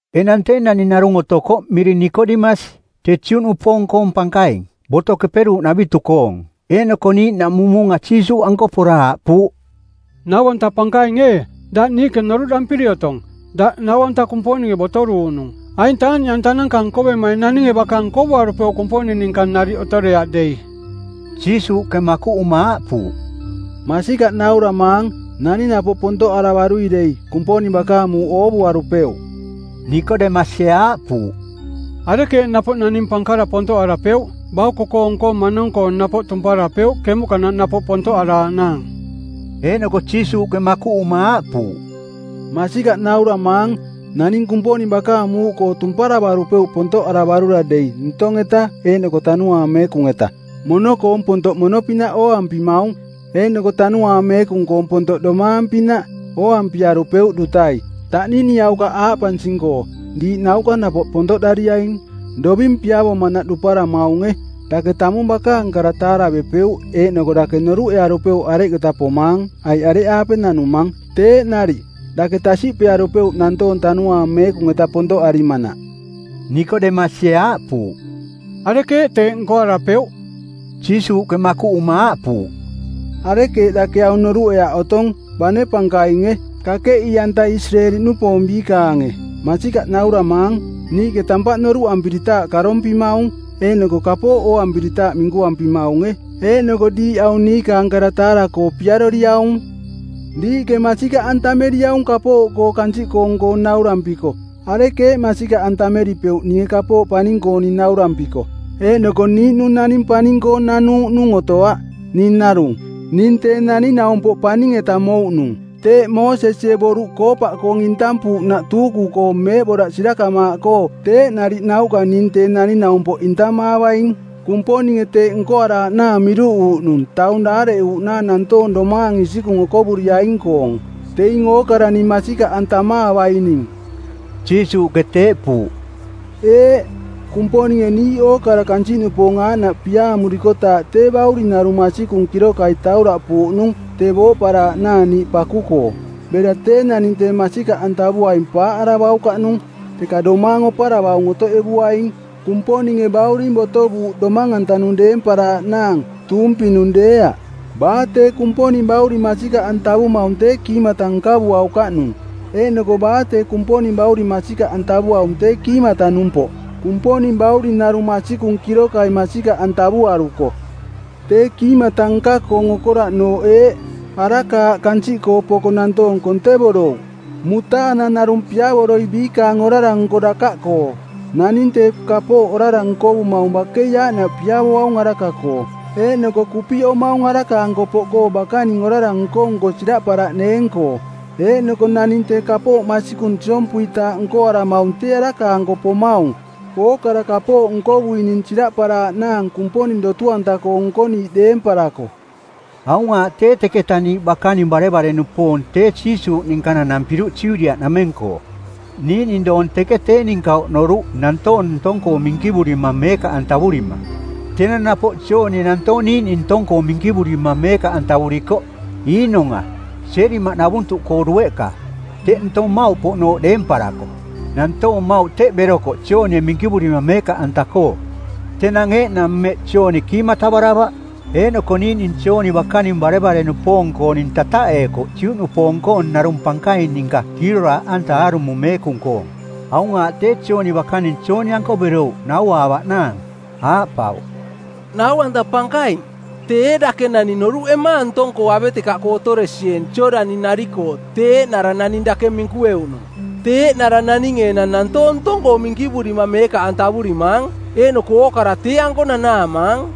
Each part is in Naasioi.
Enang tee naning narung otokoꞌ miring Nikodemasi. Tee Juꞌnupoong-koong pankaing, Boto Keperuuꞌnavitu-koong˜. Eeꞌnoko niiꞌnaꞌmung muunga Jiisuuꞌanko pora aaꞌpuuꞌ, “Nau-anta Pankaing ee, daꞌ niiꞌke noruꞌdampiri otong. Daꞌ nau-anta Kumponinge botoruuꞌnung. Aing taaꞌniꞌantananka nkovemaing naninge baka nkovuarupeuꞌ Kumponing ninka nariꞌ otoreaꞌ dei.” Jiisuuꞌke makuꞌuma aaꞌpuuꞌ, “Masikaꞌ nauramaang, naning napoꞌ pontoꞌaravarui dei, Kumponing bakaang muuꞌ oovuarupeuꞌ.” Nikodemasie aaꞌpuuꞌ, “Arekeeꞌ napoꞌ naning pankara pontoꞌarapeuꞌ? Bauko-koong-koo manong-koo napoꞌ tumparavarupeuꞌ kemuꞌkanaꞌ napoꞌ pontoꞌaraaꞌnaang.” Eeꞌnoko Jiisuuꞌke makuꞌuma aaꞌpuuꞌ, “Masikaꞌ nauramaang, naning Kumponing bakaang muuꞌkoo tumparavarupeuꞌ pontoꞌaravarui dei ntong-eta eeꞌnoko Tanuaang Meekung-eta. Mono-koong pontoꞌ mono-pinaꞌ ooampimaung, eeꞌnoko Tanuaang Meekung-koong pontoꞌ domaang-pinaꞌ ooampiarupeuꞌ dutai. Taꞌniniaukaꞌ aaꞌpansing-koo, ‘Diiꞌ nauꞌka napoꞌ pontoꞌdariaing.’ Doving piavomanaꞌ duparama eevumaunge. Dake tamung bakaang kara taaravepeuꞌ eeꞌnoko dake noruꞌearupeuꞌ areketa pomaang aiꞌ areꞌaape nanumang. Teeꞌ nariꞌ, dake tasiꞌpearupeuꞌ nantoong Tanuaang Meekung-eta pontoꞌarimanaꞌ.” Nikodemasie aaꞌpuuꞌ, “Arekeeꞌ teeꞌ nkoarapeuꞌ?” Jiisuuꞌke makuꞌuma aaꞌpuuꞌ, “Arekeeꞌ dake aung noruꞌeaꞌ otong bane pankainge, kakeꞌii-anta Isireeli-nupoong biikaange? Masikaꞌ nauramaang, niiꞌke tampaꞌ noruꞌampiritaaꞌ karompimaung, eeꞌnoko kapooꞌ ooampiritaaꞌ minkuampimaunge. Eeꞌnoko diiꞌ aung niikaang kara taara-koo piaroriaung. Diiꞌke masikaꞌantameriaung kapooꞌkoo kansiꞌkoong-koo naurampiko arekeeꞌ masikaꞌantameripeuꞌ ninge kapooꞌ paning-kooning naurampiko? Eeꞌnoko niiꞌnung naning paning-koo nanuuꞌnung otoaꞌ, ning narung, ning Tee Naning-naumpoꞌ Paning-eta mouꞌnung. Teeꞌ Moosesie boruꞌ koopaꞌkoong intampuuꞌnaꞌ tuuku-koo meeꞌboraꞌ sirakamaaꞌkoo teeꞌ nariꞌ nauꞌka ning Tee Naning-naumpoꞌ intamaavaing. Kumponinge teeꞌ nkoaraaꞌnaang miruꞌuuꞌnung taung daareꞌuuꞌnaang nantoong domaang isikung okovuriaing-koong, teing ookara ning masikaꞌantamaavaining.” Jiisuuꞌke teeꞌpuuꞌ. Eeꞌ, Kumponinge niiꞌ ookara kansiꞌnupoong aaꞌnaꞌ piaamurikotaaꞌ tee Bauring narung masikung kirokai tauraꞌpuuꞌnung tee booꞌparaaꞌnaang niiꞌ paku-koo; bera tee naning tee masikaꞌantavuaing paaꞌaravaukaꞌnung, teka domaang oparavaung otoꞌevuaing. Kumponinge Bauring botovuuꞌ domang-antanung deemparaaꞌnaang, tuumpinung deeaꞌ. Baa tee Kumponing Bauring masikaꞌantavumaung tee kiimata nkavuaukaꞌnung, eeꞌnoko baa tee Kumponing Bauring masikaꞌantavuaung tee kiimata-numpoꞌ, Kumponing Bauring narung masikung kirokai masikaꞌantavuaruko. Tee kiimata nka-koong okoraꞌnooꞌ eeꞌ: Araka aꞌ kansiꞌkoo poko nantoong kontevorouꞌ, mutaanang narung piavoroi biikaang orara-nko dakaꞌkoo. Naning tee kapooꞌ orara nkovumaung bakei aaꞌnaꞌ piavoaung araka-koo eeꞌnoko kupiꞌomaung araka-anko poꞌkoo bakaning orara nko-nko siraꞌparaꞌneeng-koo. Eeꞌnoko naning tee kapooꞌ masikung siompuitaaꞌ nkoaramaung tee araka-anko pomaung, ookara kapooꞌ nkovuining siraꞌparaaꞌnaang Kumponing dotu-anta-koo nkoniiꞌ deemparako. Aung aaꞌ tee teketa niiꞌ bakaning barevare-nupoong tee Jiisuuꞌ ninka nanampiruꞌ Judiaꞌnameng-koo. Niiꞌning doong teke tee ninka oꞌnoruꞌ nantoong ntong-koo minkivurima meekaꞌantavurima. Tenang napoꞌ Joonie nantoong niiꞌning ntong-koo minkivurima meekaꞌantavurikoꞌ Iinong-a, Sielimaꞌnavuntuꞌkoo dueꞌka, teꞌ ntong mmauꞌpoꞌnooꞌ deemparako. Nantoong mmauꞌ teꞌ berokoꞌ Joonie minkivurira meekaꞌanta-koo. Tenang eeꞌnang mmeꞌ Jooni kiimatavaravaꞌ. Eeꞌnoko niiꞌning Jooni bakaning barevare-nupoong-kooning tataꞌeekoꞌ Juꞌnupoong-koong narung pankaing ninka kiiroraaꞌanta aarumo meekung-koong. Aung aaꞌ tee, Jooni bakaning Jooni-anko berouꞌ nauaavaꞌnaang. Aaꞌpauꞌ, “Nau-anta Pankaing, tee ee dake naning noruꞌemaang ntong-koo avetekaꞌkoo otoresieeng Jooꞌdani-nari-koo tee eeꞌnara naning dake minkueuꞌnung? Tee eeꞌnara naninge enang nantoong ntong-koo minkivurima meekaꞌantavurimaang, eeꞌnoko ookara tee-anko nanaamaang.”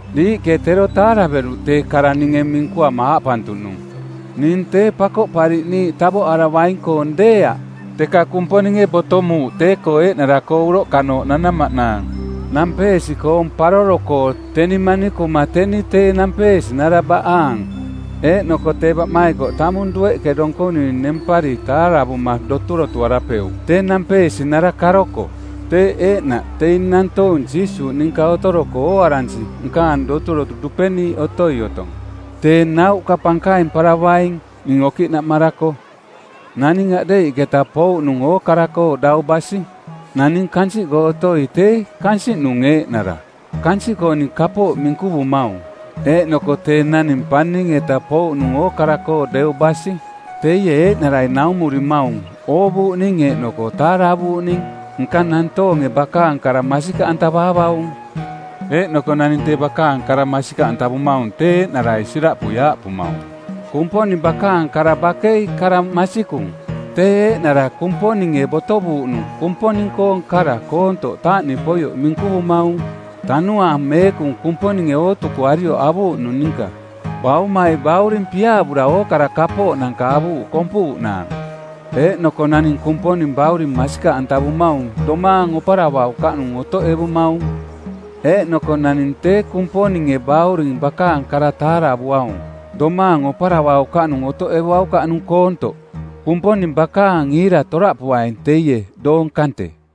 Diiꞌke tero taaraveruꞌ tee kara ninge minkuama aaꞌpantuꞌnung, ‘Ning tee Pakoꞌpariꞌniiꞌ tavoꞌaravaing-koong deeaꞌ, teka Kumponinge botomuuꞌ tee-koo eeꞌnara-koo uroꞌkanooꞌ nanamaꞌnaang.’ Nampeesi-koong paroro-koo, teni manikuma teni tee nampeesinara baꞌaang. Eeꞌnoko tee baꞌmaikoꞌ tamung dueꞌke donkonui nempari taaravuma doturotuarapeuꞌ tee nampeesinara karoko. Teeꞌ eeꞌnaꞌ teing nantoong Jiisuuꞌ ninka otoroko ooaransi nkaang doturotu dupeniiꞌ otoi otong. Tee nauꞌka pankaimparavaing ning okiꞌnaꞌmarako.” Naning aꞌdeiꞌketa pouꞌnung ookara-koo dau basi. Naning kansiꞌkoo otoi tee kansiꞌnung eeꞌnara, kansiꞌkooning kapooꞌ minkuvumaung. Eeꞌnoko tee naning paning-eta pouꞌnung ookara-koo deu basi. Teie eeꞌnarai naumurimaung oovuuꞌning eeꞌnoko taaravuuꞌning. Nka nantoonge bakaang kara masikaꞌantavaavaung. Eeꞌnoko naning tee bakaang kara masikaꞌantavumaung tee eeꞌnarai siraꞌpui aaꞌpumaung, “Kumponing bakaang kara bakei kara masikung.” Tee eeꞌnara Kumponinge botovuuꞌnung Kumponing-koong kara koontoꞌ taaꞌniꞌpoioꞌ minkuvumaung, Tanuaang Meekung Kumponinge ootukuarioꞌ avuuꞌnung ninka. Baumai Bauring piaavura ookara kapooꞌnanka avuuꞌ kompuuꞌnaang. Eeꞌnoko naning Kumponing Bauring masikaꞌantavumaung domaang oparavaukaꞌnung otoꞌevumaung. Eeꞌnoko naning tee Kumponinge Bauring bakaang kara taaravuaung domaang oparavaukaꞌnung otoꞌevuaukaꞌnung koontoꞌ. Kumponing bakaang iira toraꞌpuaing teie doong kante.